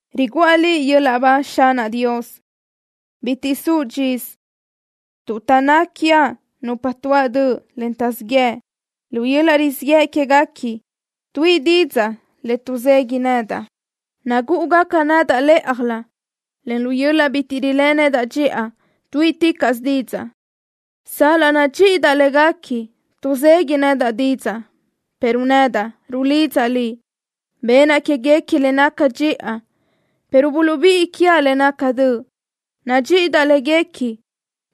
Riguʼa Liʼ yöl-laʼ ba, Xanaʼ Dios. Bitiʼ suʼ dxisö, tuʼ taʼnná quiaʼ nupa tuáʼ döʼ, en taʼzíʼ yëʼ. Lu yöl-laʼ rizíʼ yëʼ quéguequi tuíʼi didzaʼ le tuʼzeguiʼ nedaʼ. Nagúʼugaca nedaʼ lë́ʼajlö, en lu yöl-laʼ bitiʼ riléʼe nedaʼ dxiʼa tuíʼiticaʼsö didzaʼ. Sal-laʼ nadxíʼidaʼ léguequi, tuʼzeguiʼ nedaʼ didzaʼ, pero nedaʼ rulidzaʼ Liʼ. Benaʼ quéguequi le naca dxiʼa, pero buluʼbíʼi quiaʼ le naca döʼ. Nadxíʼidaʼ léguequi,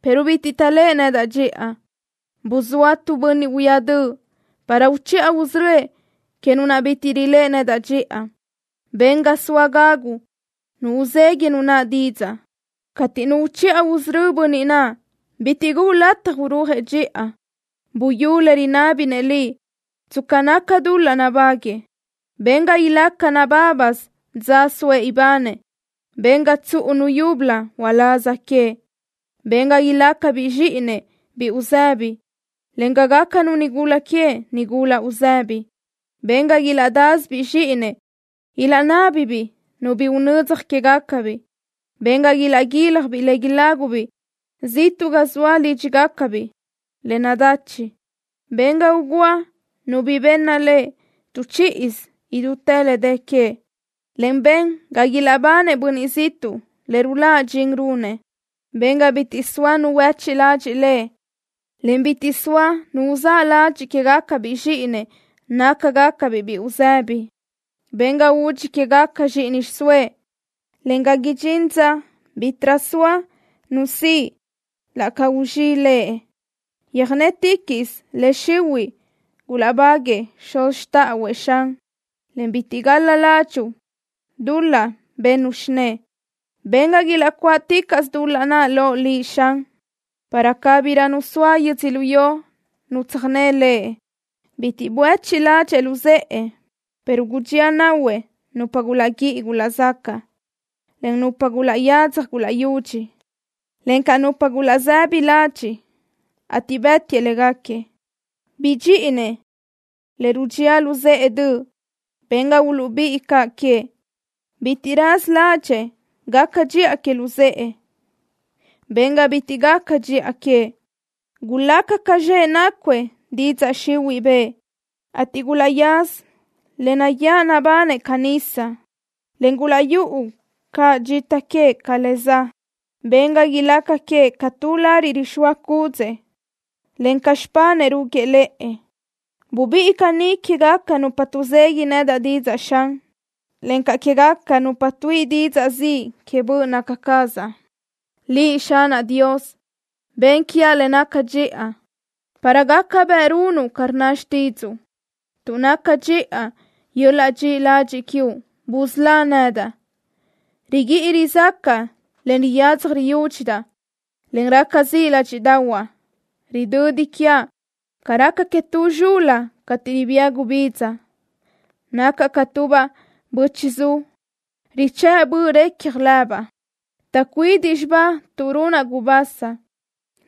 pero bitiʼ taʼléʼe nedaʼ dxiʼa. Buzóa tu bönniʼ huíaʼ döʼ para uchiʼa usörö́ëʼ que nu naʼ bitiʼ riléʼe nedaʼ dxiʼa. Ben ga soa gagu nu uzeguiʼ nu naʼ didzaʼ. Cateʼ nu uchiʼa usörö́ bönniʼ naʼ, bitiʼ guʼu lataj urúajëʼ dxiʼa. Buyú le rinábinëʼ Liʼ tsca naca dul-laʼ nabáguëʼë. Ben ga ilaca nabábasö dza soëʼ ibanëʼ. Ben ga tsuʼu nu yúbölö uláz queëʼ. Ben ga ilácabiʼ zxíʼinëʼ biʼi uzëbi, en ga gácanu nigula queëʼ nigula uzëbi. Ben ga ilaʼdásöbiʼ zxíʼinëʼ ilaʼnábibiʼ nu bi unödzaj quégacabiʼ. Ben ga ilaʼguíljabiʼ le ilágubiʼ ziʼtuʼ ga zoa lídxigacabiʼ le nadachi. Ben ga ugúa nu bi benna lëʼ tu chíʼisö idútë le dë queëʼ, en ben ga ilaʼbanëʼ bönniʼ ziʼtuʼ le ruláʼ dxin runëʼ. Ben ga bitiʼ soa nu huéchiʼ ladxiʼ lëʼ, en bitiʼ soa nu uzáʼ ladxiʼ quégacabiʼ zxíʼinëʼ nácagacabiʼ biʼi uzëbi. Ben ga udxi quégaca zxíʼini xiʼsóëʼ, en ga idxín dza bítiʼrö soa nu siʼ la ca guzxíʼi lëʼ. Yöjnéticaʼsö le xihuiʼ gulaʼbáguëʼë xuz xtáʼahuëʼ, Xan, en bitiʼ gal-la ládxuʼu dul-laʼ bennu xinë́ʼë. Ben ga ilaʼcuáʼticaʼsö dul-laʼ naʼ loʼ Liʼ, Xan, para cabirö nu soa yödzölió nu tsöjné lëʼ. Bitiʼ buéchiʼ ládxëʼë luzë́ʼë, pero gudxía nahuëʼ nupa gulaʼguíʼi gulaʼzacaʼ, en nupa gulaʼyadzaj gulaʼyudxi, encaʼ nupa gulaʼsëbi ladxiʼ, ateʼ bë́tiëʼ léguequi. Bidxíʼinëʼ le rudxía luzë́ʼë döʼ. Ben ga uluʼbíʼi caʼ queëʼ. Bitiʼ raza ládxëʼë gaca dxiʼa que luzë́ʼë. Ben ga bitiʼ gaca dxiʼa queëʼ. Gulaca ca zxëʼ nácuëʼ didzaʼ xihuiʼ bëʼë, ateʼ gulaʼyaza le nayáʼ nabanëʼ ca nisa, en gulaʼyúʼu caʼ dxita queëʼ ca le za. Ben ga ilaca queëʼ ca tu lariʼ rixóa cúdzëʼë, en ca xipanëʼ rúguiʼë lëʼë. Bubíʼi caní quégaca nupa tuʼzeguiʼ nedaʼ didzaʼ, Xan, encaʼ quégaca nupa tuíʼi didzaʼ ziʼ que böʼ naca cazaʼ. Liʼ, Xanaʼ Dios, ben quiaʼ le naca dxiʼa para gaca bëʼ runuʼ ca rnna xtídzuʼu. Tuʼ naca dxiʼa yöl-laʼ dxiʼi ladxiʼ quiuʼ, busölá nedaʼ. Riguíʼi rizácaʼa, en riyadzaj riyúdxidaʼ, en raca ziʼ ládxiʼdaʼahuaʼ. Ridödi quiaʼ ca raca que tu zxul-la cateʼ ribía gubidza. Nacaʼ ca tubaʼ bö́chiʼzu, richë́ʼ böʼ recja lëbaʼ. Taʼcuidiʼ zxibaʼ tuʼ runaʼ gubasa.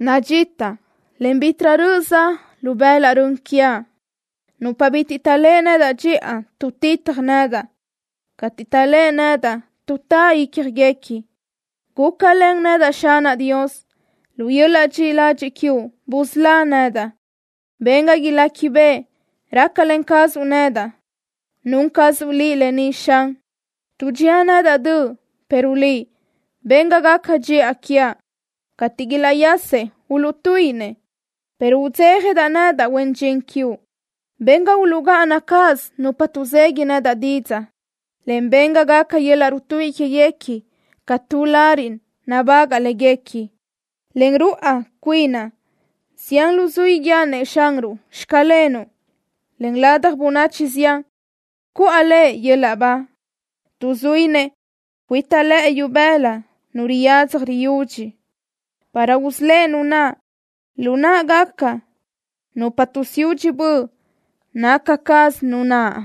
Nadxitaʼ, en bítiʼrö röʼö za lu bëlaʼ rön quiaʼ. Nupa bitiʼ taʼléʼe nedaʼ dxiʼa tuʼtitaj nedaʼ. Cateʼ taʼléʼe nedaʼ, tuʼtá ícjaguequi. Gúcalen nedaʼ, Xanaʼ Dios. Lu yöl-laʼ dxiʼi ladxiʼ quiuʼ busölá nedaʼ. Ben ga iléquibeʼe rácalen cazuʼ nedaʼ. Nun cazuʼ Liʼ lë ni, Xan. Tuʼdxía nedaʼ döʼ, pero Liʼ, ben ga gaca dxiʼa quiaʼ. Cateʼ ilaʼyasëʼ, uluʼtuíʼinëʼ, pero udzéjadaʼ nedaʼ, huen dxin quiuʼ. Ben ga uluʼgáʼana cáʼasö nupa tuʼzeguiʼ nedaʼ didzaʼ, en ben ga gaca yöl-laʼ rutuíʼi quéguequi ca tu lariʼ nabagaʼ léguequi. Len ruáʼ cuinaʼ, zián luzuí guíaʼ-nëʼ Xanruʼ: “Xclenuʼ”, en ladaj bönachi zián cuʼa Lëʼ yöl-laʼ ba, tuʼ zuínëʼ cuita lëʼe ibëla nu riyadzaj riyudxi para usölë́ʼ nu naʼ lu náʼagaca nupa tuʼsiúdxi böʼ naca caz nu naʼ.